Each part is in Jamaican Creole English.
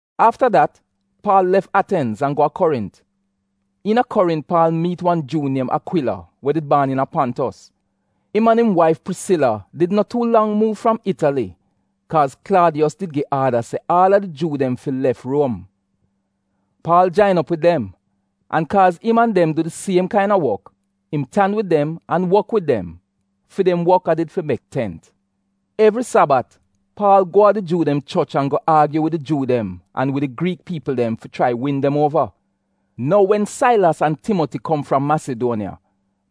Afta dat Paal lef Atenz an go a Korint. Iina Korint Paal miit wan Juu niem Akwila we did baan iina Pontos. Im an im waif Prisila did no tuu lang muuv fram Itali kaaz Klaadiyos did gi aada se aal a di Juu dem fi lef Ruom. Paal jain op wid dem, an kaaz im an dem du di siem kaina wok, im tan wid dem an wok wid dem (fi dem wok a did fi mek tent). Evri Sabat Paal go a di Juu dem choch an go aagyu wid di Juu dem an wid di Griik piipl dem fi chrai win dem uova. Nou wen Sailas an Timoti kom fram Masiduoniya,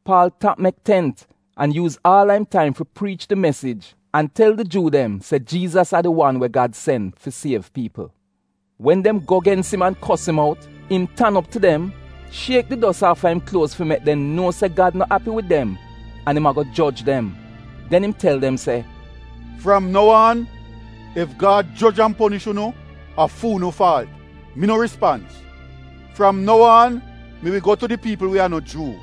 Paal tap mek tent an yuuz aal a im taim fi priich di mesij an tel di Juu dem se Jiizas a di wan we Gad sen fi siev piipl. Wen dem go gens im an kos im out, im tan op tu dem, shiek di dos aafa im kluoz fi mek dem nuo se Gad no api wid dem an im ago joj dem. Den im tel dem se, “Fram nou aan, ef Gad joj an ponish unu a fu'unu faalt! Mi no rispans! Fram nou aan mi wi go tu di piipl we a no Juu.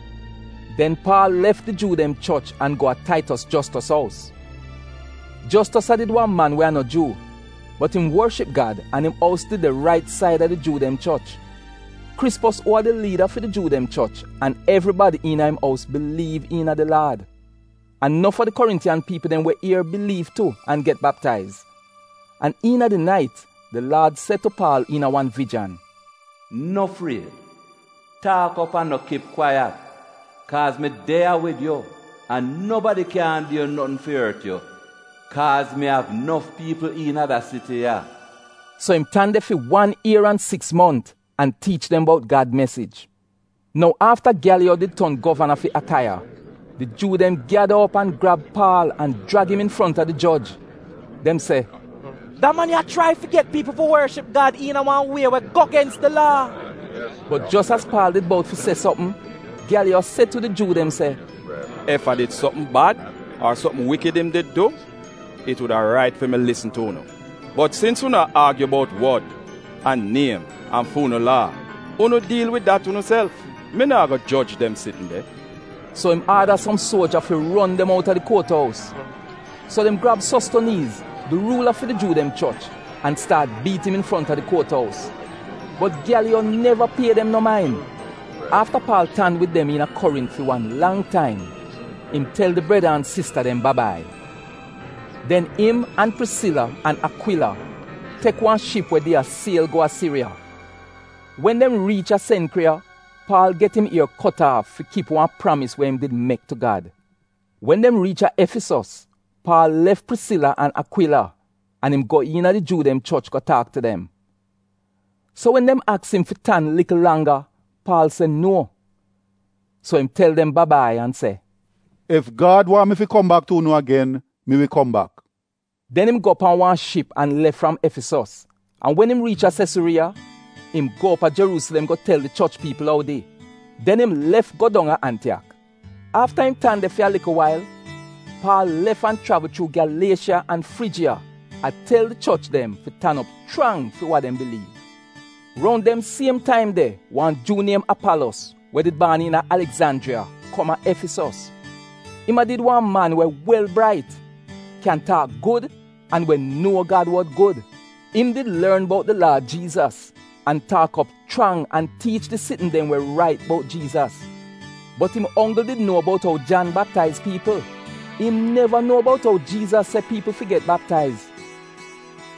Den Paal lef di Juu dem choch an go a Taitos Jostos ous. Jostos a did wan man we a no Juu, bot im worship Gad an im ous did de rait saida di Juu dem choch. Krispos uu a di liida fi di Juu dem choch an evribadi iina im ous biliiv iina di Laad. An nof a di Korintiyan piipl dem we ier biliiv tu an get baptaiz. An iina di nait di Laad se tu Paal iina wan vijan, “No fried, taak op an no kip kwaiyat, kaaz mi de ya wid yu, an nobadi kyaahn du notn fi ort yu, kaaz mi av nof piipl iina da siti ya.” So im tan de fi wan ier an siks mont an tiich dem bout Gad mesij. Nou afta Gyaliyo did ton govana fi Akaiya di Juu dem gyada op an grab Paal an jrag im infronta di joj, dem se, “Da man ya a chrai fi get piipl fi worship Gad iina wan wie we go gens di Laa!” Bot jos az Paal did bout fi se sopm, Gyaliyo se tu di Juu dem se, “Ef a did sopm bad ar sopm wikid im did du, it wuda rait fi mi lisn tu unu. Bot sins unu a aagyu bout wod, an niem an fi unu Laa, unu diil wid dat unuself. Mi naa go joj dem sitn de.” So im aada som suoja fi ron dem outa di kuot ous. So dem grab Sostoniiz, di ruula fi di Juu dem choch, an staat biit im infronta di kuot ous. Bot Gyaliyo neva pie dem no main. Afta Paal tan wid dem iina Korint fi wan lang taim, im tel di breda an sista dem ba-bai. Den im an Prisila an Akwila tek wan ship wa did a siel go a Siriya. Wen dem riich a Senkriya Paal get im ier kot aaf fi kip wan pramis we im did mek tu Gad. Wen dem riich a Efisos Paal lef Prisila an Akwila an im go iina di Juu dem choch go taak tu dem. So wen dem aks im fi tan likl langga, Paal se nuo. So im tel dem ba-bai an se “Ef Gad waahn mi fi kom bak tu unu agen, mi wi kom bak.” Den im go pan wan ship an lef fram Efisos, an wen im riich a Sesuriiya, im go op a Jeruusilem go tel di choch piipl oudi. Den im lef go dong a Antiyak. Afta im tan de fi a likl wail, Paal lef an chravl chuu Gyaliesha an Frijiya a tel di choch dem fi tan op chrang fi wa dem biliiv. Roun dem siem taim de wan Juu niem Apalos, we did baan iina Aligzanjriya kom a Efisos. Im a did wan man we wel brait, kyan taak gud, an we nuo Gad wod gud. Im did lorn bout di Laad Jiizas, an taak op chrang an tiich di sitn dem we rait bout Jiizas. Bot im onggl di nuo bout ou Jan baptaiz piipl, im neva nuo bout ou Jiizas se piipl fi get baptaiz.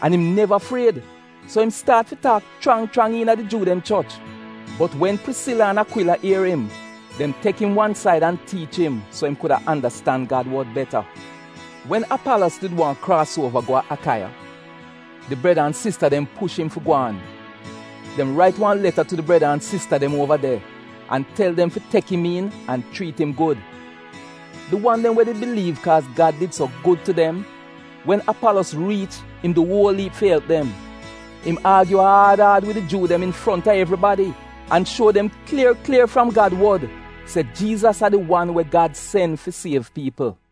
An im neva fried, so im staat fi taak chrang chrang iina di Juu dem choch, bot wen Prisila an Akwila ier im, dem tek im wan said an tiich im so im kuda andastan Gad wod beta. Wen Apalos did waahn kraas uova go a Akaiya, di breda an sista dem push im fi gwaan. Dem rait wan leta tu di breda an sista dem uova de an tel dem fi tek im iin an chriit im gud. Di wan dem we did biliiv kaaz Gad did so gud tu dem, wen Apalos riich im du uol iip fi elp dem. Im aagyu aad aad wid di Juu dem infronta evribadi, an shuo dem klier klier fram Gad wod se Jiizas a di wan we Gad sen fi siev piipl.